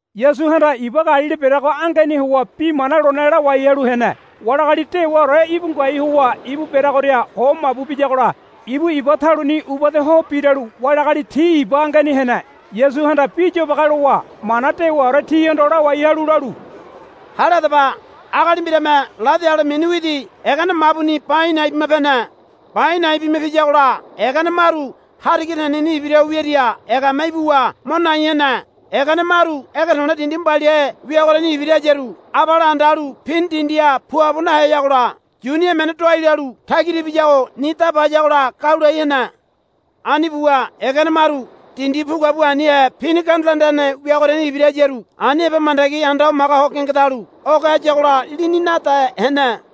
Yasuhanda iba Galili bereago angeni howa bi mana lone lawai halu hene. Wali agali dewaore íbu ngoai howa ibu bereagoria ho mabu biyagola ibu iba taluni ubade ho biralu wali agali ti iba angeni hene. Yasuhanda bi yobage lowa mana dewaore tihondo lawai halu lalu, Hale hadaba. Agali mbirame ladi ale mini widi egene mabuni ba a̱i̱ na̱i̱ bima pene. Ba a̱i̱ na̱i̱ bima piyagola egene maru hariga teneni ibira ho wiaria egame ibuwa mo nai hene. Egene maru ege to̱le̱ dindi mbaliahe wiagoriani ibira hayaru abale anda halu pini dindiha puabo naheyagola yuni emene doai lalu tagira ibiyago ni daba hayagola gau lai hene. Ani buwa egene maru dindi pu kuabu anihe pini gandula anda hene wiagoriani ibira hayaru ani heba mandagi anda hamaga ho gengedalu oge hayagola lini nade hene.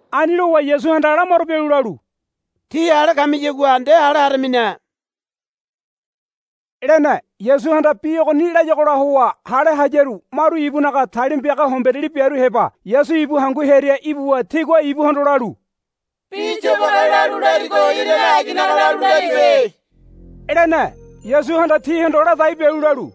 Ani lowa Yasuhanda lamaro bialu lalu, Tí hale kamiyagua nde hale haramine, lene. Yasuhanda bi ogoni layagola howa hale hayaru maru ibunaga talima piaga homberiali biaru heba Yasu ibu hangu hearia ibuwa tigua ibuhondo lalu, Bi yobage lalu larigo irane aginaga lalu laribe, lene. Yasuhanda tihondo ladai bialu lalu,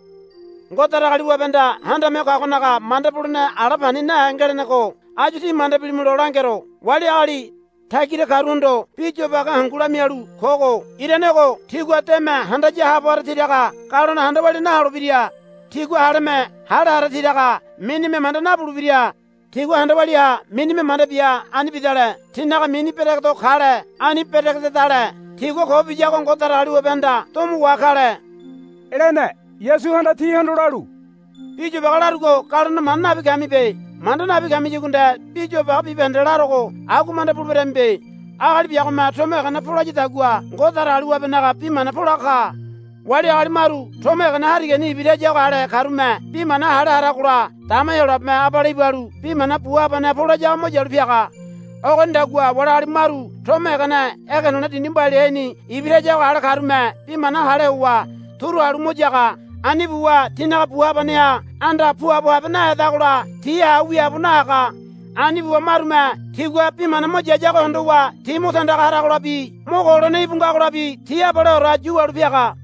Ngode Datagaliwabehanda Handame Ho Kagonaga manda bulene ala pani nahe ngelenego áyu tí manda bilimulo langero. Wali agali tagira karuhondo bi yobage hangu lamialu kogo irane ogo, Tigua deme handaya haabo hara tiraga galone handa walia naholebira. Tigua haleme hale hara tiraga minime manda nabulebira. Tigua handa walia ha minime manda bia ani bidale tinaga mini beregedo kale. Ani beregedale tigua ko biyago Ngode Datagaliwabehanda domo wa kale, lene. Yasuhanda tihondo lalu, Bi yobage larugo galone manda nabi kamibe. Manda nabi kamiyagua nde bi yobage bibahende larogo agua manda buleberamibe. Agali biagome tomo egene polayadagua Ngode Datagaliwabenaga bi mana polaga ka. Wali agali maru tomo egene harigani ibira hayago ale karume bi mana hale haragola dama Heyolabeme abale ibalu bi mana bu habaneha polayago mo yalu piaga. Ogonidagua wali agali maru tomo egene ege to̱le̱ dindi mbaliaheni ibira hayago ale karume bi mana hale howa turu halu mo yaga. Ani buwa tinaga bu habaneha anda puabo habe nahedagola ti ha wiaabo nahaga. Ani buwa marume tigua bi mana mo yayago hondowa ti mo tandaga haragolabi mo ko holene íbu ngagolabi ti abaleore yu wahalu piaga.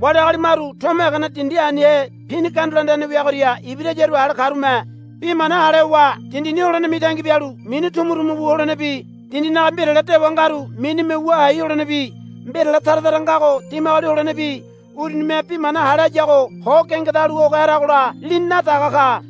Wali agali maru tomo egene dindi anihe pini gandula anda hene wiagoria ibira hayago ale karume bi mana hale howa dindini holene mitangi bialu mini tumutumu wu holenebi dindinaga mbirale dewa ngaru minime wua hai holenebi mbirale tara tara ngago dimagoli holenebi urunime bi mana hale hayago ho gengedalu oge haragola lini nadaga ka.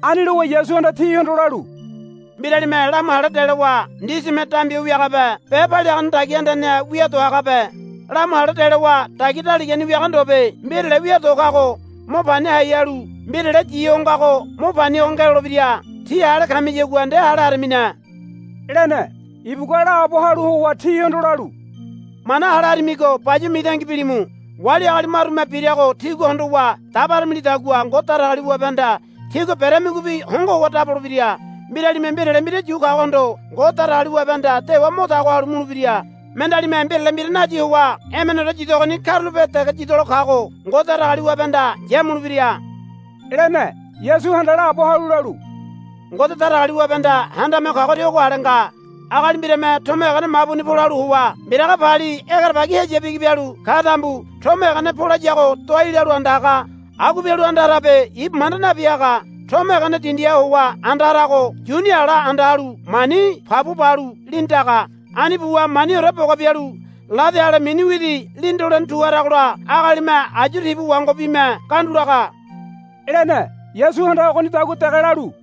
Ani lowa Yasuhanda tihondo lalu, Mbiralime lamu hale delowa ndisime dambi ho wiagabe be paliagane dagia andaneha wia do hagabe. Lamu hale delowa dagia daligani wiaga ndobe. Mbirale wia do kago mo pani hai halu mbirale yi ho ngago mo pani ho ngelolebira. Tí hale kamiyagua nde hale haramine, lene. Ibugua laabo halu howa tihondo lalu, Mana hale haramigo bayuwa mitangi bilimu. Wali agali marume birago tígua hondowa dabaramilidagua Ngode Datagaliwabehanda tígua beramigobi hongo howa dabolebira. Mbiralime mbirale mbira yu kagohondo Ngode Datagaliwabehanda dewa mo tago halu mulebira. Mendealime mbirale mbira nayi howa emeneore yidogoni karulape dege yidolo kago Ngode Datagaliwabehanda yamulebira, lene. Yasuhanda laabo halu lalu, Ngode Datagaliwabehanda Handame Ho Kagoria ogo ale nga. Agali mbirame tomo egene mabuni polalu howa mbiraga pali egerebagi heya bigi bialu ka tambu tomo egene polayago doai lalu anda haga. Agua bialu anda harabe ibu manda nabi haga. Tomo egene dindiha howa anda harago yuni ala anda halu mani pabua balu lini daga. Ani buwa maniore boga bialu ladi ale mini widi lini dolene tu haragola agalime ayu tibu wangobime gandulaga, lene. Yasuhanda ogonidagua dege lalu,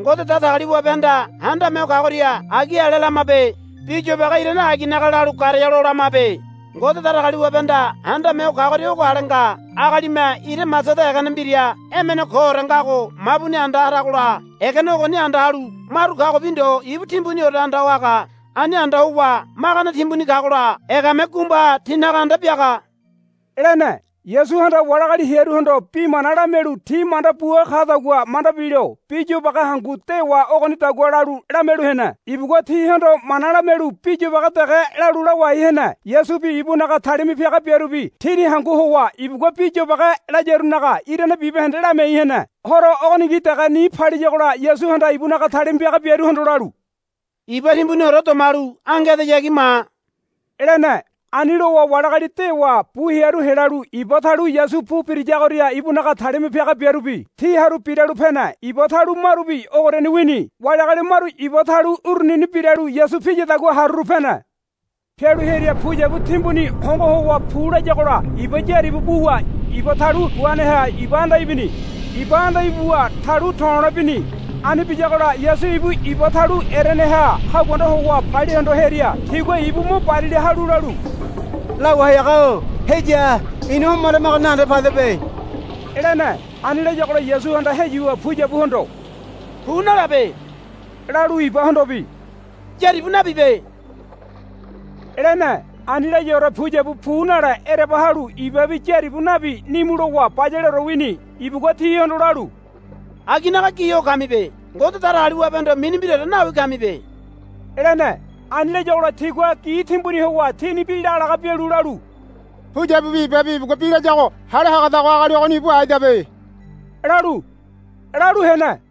Ngode Datagaliwabehanda Handame Ho Kagoria agi ale lamabe. Bi yobage irane aginaga lalu garea lo lamabe. Ngode Datagaliwabehanda Handame Ho Kagoria ogo ale nga. Agalime ira masada egene mbira emene koore ngago mabuni hangaragola egene ogoni anda halu maru kagobi ndo ibu timbuniore anda ho haga. Ani anda howa magane timbuni kagola egame gumbaha tinaga anda biaga, lene. Yasuhanda wali agali hearuhondo bi mana lamialu ti manda bua kadagua manda bilo bi yobage hangu dewa ogonidagua lalu lamialu hene. Ibugua tihondo mana lamialu bi yobage dege lalu lawai hene. Yasubi ibunaga talima piaga biarubi tini hangu howa ibugua bi yobage layarunaga irane bibahende lamiai hene. Horo ogoningi dege ni paliyagola Yasuhanda ibunaga talima piaga biaruhondo lalu, Iba timbuniore domalu ange edeyagi ma, lene. Ani lowa wali agali dewa bu hearu helalu iba talu Yasu pu birayagoria ibunaga talima piaga biarubi ti haru biralu pene. Iba talu marubi ogoriani wini. Wali agali maru iba talu urunini biralu Yasu piyadagua haruru pene. Pialu hearia puyabu timbuni hongo howa pulayagola iba yaribu buwa iba talu guaneha iba anda ibini. Iba anda ibuwa talu to̱lole bini. Ani biyagola Yasu ibu iba talu ereneha haguanda howa palia hondo hearia tigua ibu mo barila halu lalu, Lawai haga-o heya. Ina homaramago nahende padebe, lene. Ani layagola Yasuhanda heyuwa puyabuhondo, Pu nalabe, lalu ibahondobi, Yaribu nabibe, lene. Ani layaore puyabu pu nale ereba halu ibabi yaribu nabi nimu lowa bayaleore wini. Ibugua tihondo lalu, Aginaga gi ho kamibe. Ngode Datagaliwabehondo mini mbiraore nawi kamibe, lene. Ani layagola tigua gi timbuni howa tini bi lagalaga bialu lalu, Puyabubi ibabi ibugua bi layago hale hagadago agali ogoni ibu aidabe, lalu hene.